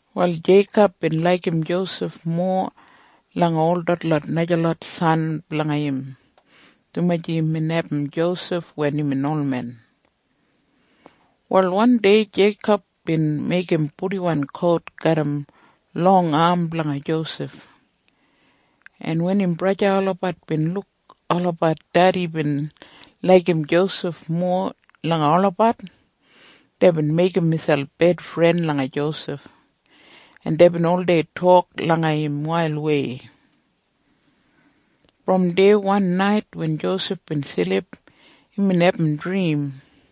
Wal Jeikob bin laigim Josef mowa langa ol detlot najalot san blanga im, dumaji imbin abum Josef wen imbin olmen. Wal wandei Jeikob bin meigim purdiwan kout garram long am blanga Josef, en wen im braja olabat bin luk olabat dedi bin laigim Josef mowa langa olabat, deibin meigim miselp bedfren langa Josef, en deibin oldei tok langa im wailwei. Brom deya wan nait wen Josef bin silip, imbin abum drim,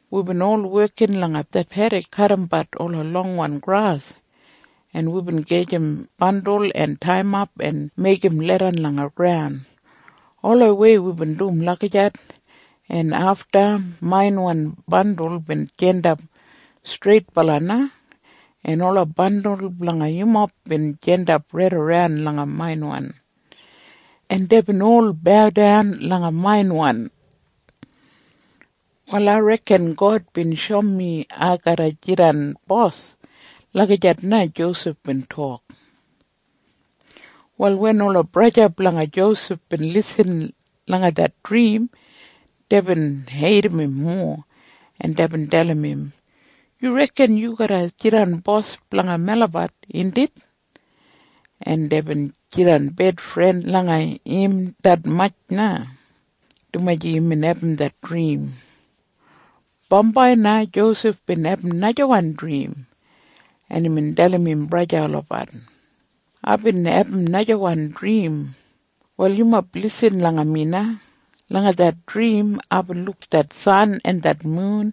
Wibin ol wekin langa det pedik kadimbat det longwan gras, en wibin gajim bandul en taiyimap en meigim leidan langa graun. Olawei wibin dum lagijat, en afta mainwan bandul bin jandap streitbala na, en ola bandul blanga yumob bin jandap raidaran langa mainwan, en deibin ol baudan langa mainwan. Wal ai reken God bin shoum mi ai garra jidan bos.” Lagijat na Josef bin tok. Wal wen ola braja blanga Josef bin lisin langa det drim, deibin heidim im mowa, en deibin dalim im, “Yu reken yu garra jidan bos blanga melabat, indit?” En deibin jidan bedfren langa im detmatj na, dumaji imbin abum det drim. Bambai na Josef bin abum najawan drim, en imbin dalim im braja olabat, “Aibin abum najawan drim. Wal yumob lisin langa mi na. Langa det drim aibin luk det san en det mun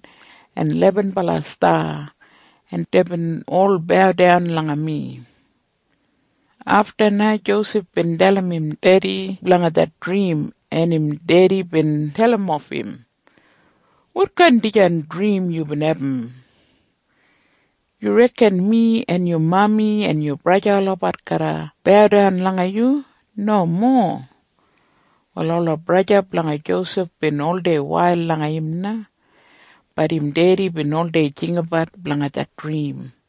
en lebenbala sta, en deibin ol baudan langa mi.” Afta na Josef bin dalim im dedi blanga det drim, en im dedi bin dalimof im, “Wotkain dijan drim yubin abum? Yu reken mi en yu mami en yu braja olabat garra baudan langa yu? Nomo!” Wal ola braja blanga Josef bin oldei wail langa im na. Bat im dedi bin oldei jinggabat blanga det drim.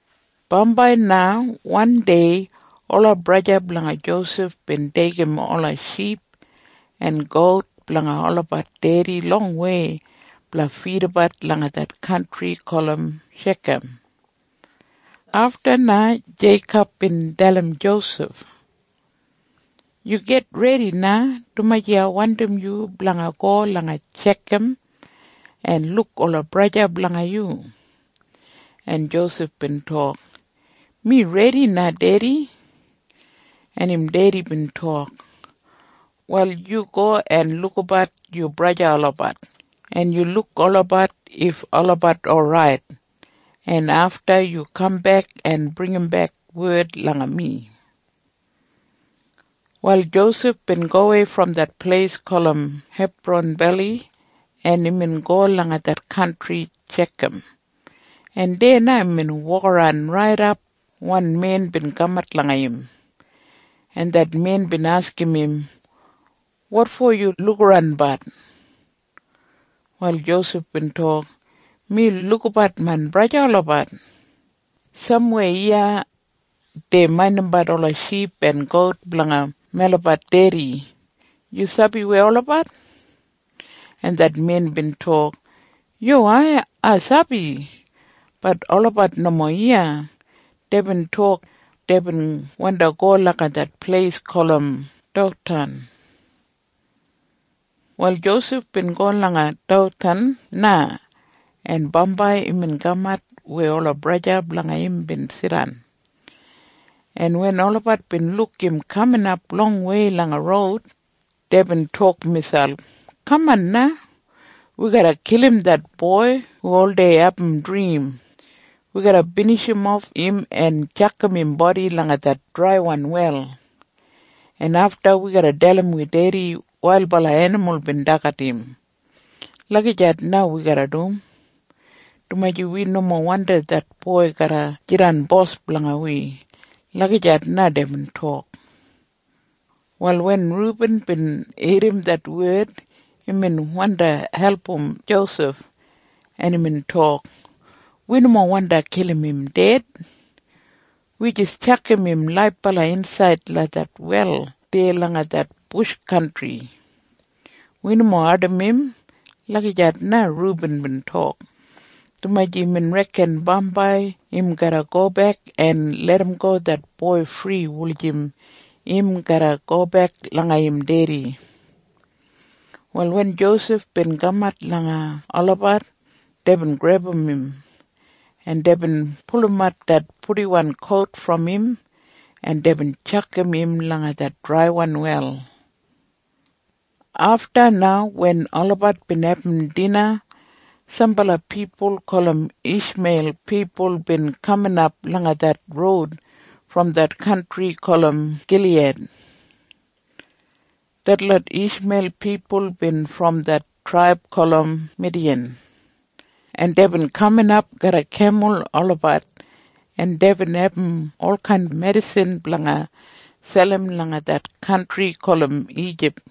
Bambai na wandei ola braja blanga Josef bin deigim ola ship en gout blanga olabat dedi longwei blanga fidabat langa det kantri gulum Shekam. Afta na Jeikob bin dalim Josef, “Yu gitredi na, dumaji ai wandim yu blanga go langa Shekam en luk ola braja blanga yu.” En Josef bin tok, “Mi redi na, Dedi.” En im dedi bin tok, “Wal yu go en lukabat yu braja olabat, en yu luk olabat if olabat orait, en afta yu kambek en bringimbek wed langa mi.” Wal Josef bin gowei brom det pleis gulum Hebran Beli, en imbin go langa det kantri Shekam, en deya na imbin wokaran raidap wan men bin kamat langa im, en det men bin askim im, “Wotfo yu lukaranbat?” Wal Josef bin tok, “Mi lukabat main braja olabat. Samweya iya dei maindimbat ola ship en gout blanga melabat dedi. Yu sabi weya olabat?” En det men bin tok, “Yuwai. Ai sabi. Bat olabat nomo iya. Deibin tok, deibin wandi go langa det pleis gulum Dothan.” Wal Josef bin go langa Dothan na, en bambai imbin kamat weya ola braja blanga im bin jidan, en wen olabat bin luk im kaminap longwei langa roud, deibin tok miselp, “Kaman na! Wi garra kilim det boi hu oldei abum drim. Wi garra binijimof im en tjakam im bodi langa det draiwan wel, en afta wi garra dalim wi dedi wailbala enimul bin dagat im. Lagijat na wi garra dum, dumaji wi nomo wandim det boi garra jidan bos blanga wi.” Lagijat na deibin tok. Wal wen Rubin bin irrim det wed, imbin wandi album Josef, en imbin tok, “Wi nomo wandi kilim im ded. Wi jis tjakam im laibala insaid langa det wel deya langa det bush kantri. Wi nomo ardim im.” Lagijat na Rubin bin tok, dumaji imbin reken bambai im garra gobek en larramgo det boi fri wulijim im garra gobek langa im dedi. Wal wen Josef bin kamat langa olabat, deibin grebum im, en deibin pulumat det purdiwan kout brom im, en deibin tjakam im langa det draiwan wel. Afta na wen olabat bin abum dina sambala pipul gulum Ishmeil pipul bin kaminap langa det roud brom det kantri gulum Giliyad. Detlot Ishmeil pipul bin brom det traib gulum Midiyan, en deibin kaminap garram kemul olabat, en deibin abum olkain medisin blanga selim langa det kantri gulum Ijip.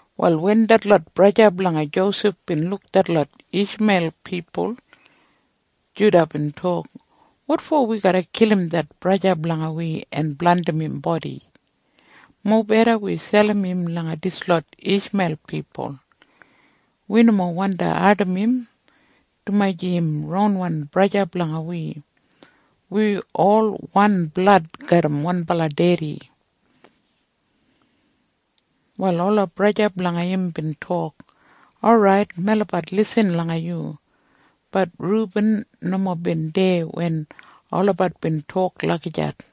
Wal wen detlot braja blanga Josef bin luk detlot Ishmeil pipul, Juda bin tok, “Wotfo wi garra kilim det braja blanga wi en blandim im bodi? Mobeda wi selim im langa dislot Ishmeil pipul. Wi nomo wandi ardim im, dumaji im ronwan braja blanga wi. Wi ol wan blad garram wanbala dedi.” Wal ola braja blanga im bin tok, “Orait, melabat lisin langa yu.” Bat Rubin nomo bin deya wen olabat bin tok lagijat.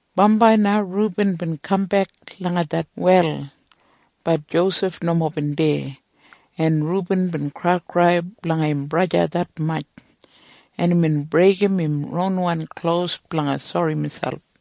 Bambai na Rubin bin kambek langa det wel. Bat Josef nomo bin deya, en Rubin bin kraikrai blanga im braja detmatj, en imbin breigim im ronwan klos blanga sori miselp.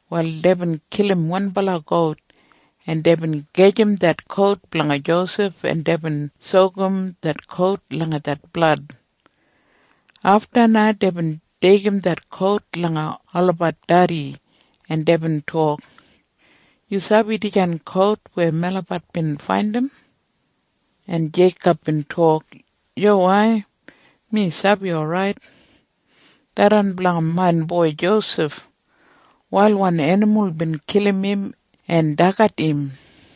Wal deibin kilim wanbala gout, en deibin gajim det kout blanga Josef, en deibin sokum det kout langa det blad. Afta na deibin deigim det kout langa olabat dedi, en deibin tok, “Yu sabi dijan kout weya melabat bin faindim?” En Jeikob bin tok, “Yuwai! Mi sabi orait! Tharran blanga main boi Josef! Wailwan enimul bin kilim im en dagat im!”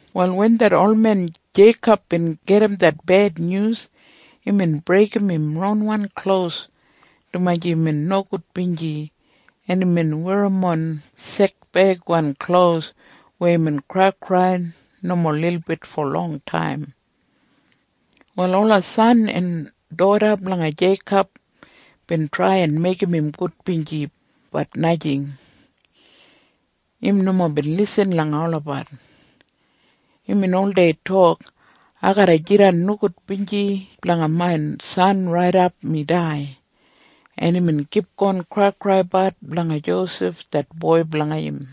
Wal wen det olmen Jeikob bin gedim det bednyus, imbin breigim im ronwan klos dumaji imbin nogudbinji, en imbin werrimon sekbeigwan klos weya imbin kraikrai nomo lilbit fo longtaim. Wal ola san en doda blanga Jeikob bin trai en meigim im gudbinji. Bat najing. Im nomo bin lisin langa olabat. Imbin oldei tok, “Ai garra jidan nogudbinji blanga main san raidap mi dai.” En imbin kipgon kraikraibat blanga Josef det boi blanga im.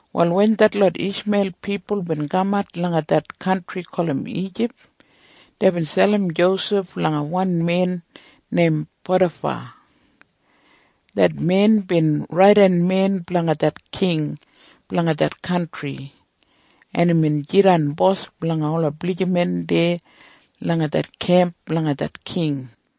Wal wen detlot Ishmeil pipul bin kamat langa det kantri gulum Ijip, deibin selim Josef langa wan men neim Potafa. Det men bin raidenmen blanga det king blanga det kantri, en imbin jidan bos blanga ola blijiman deya langa det kemp blanga det king.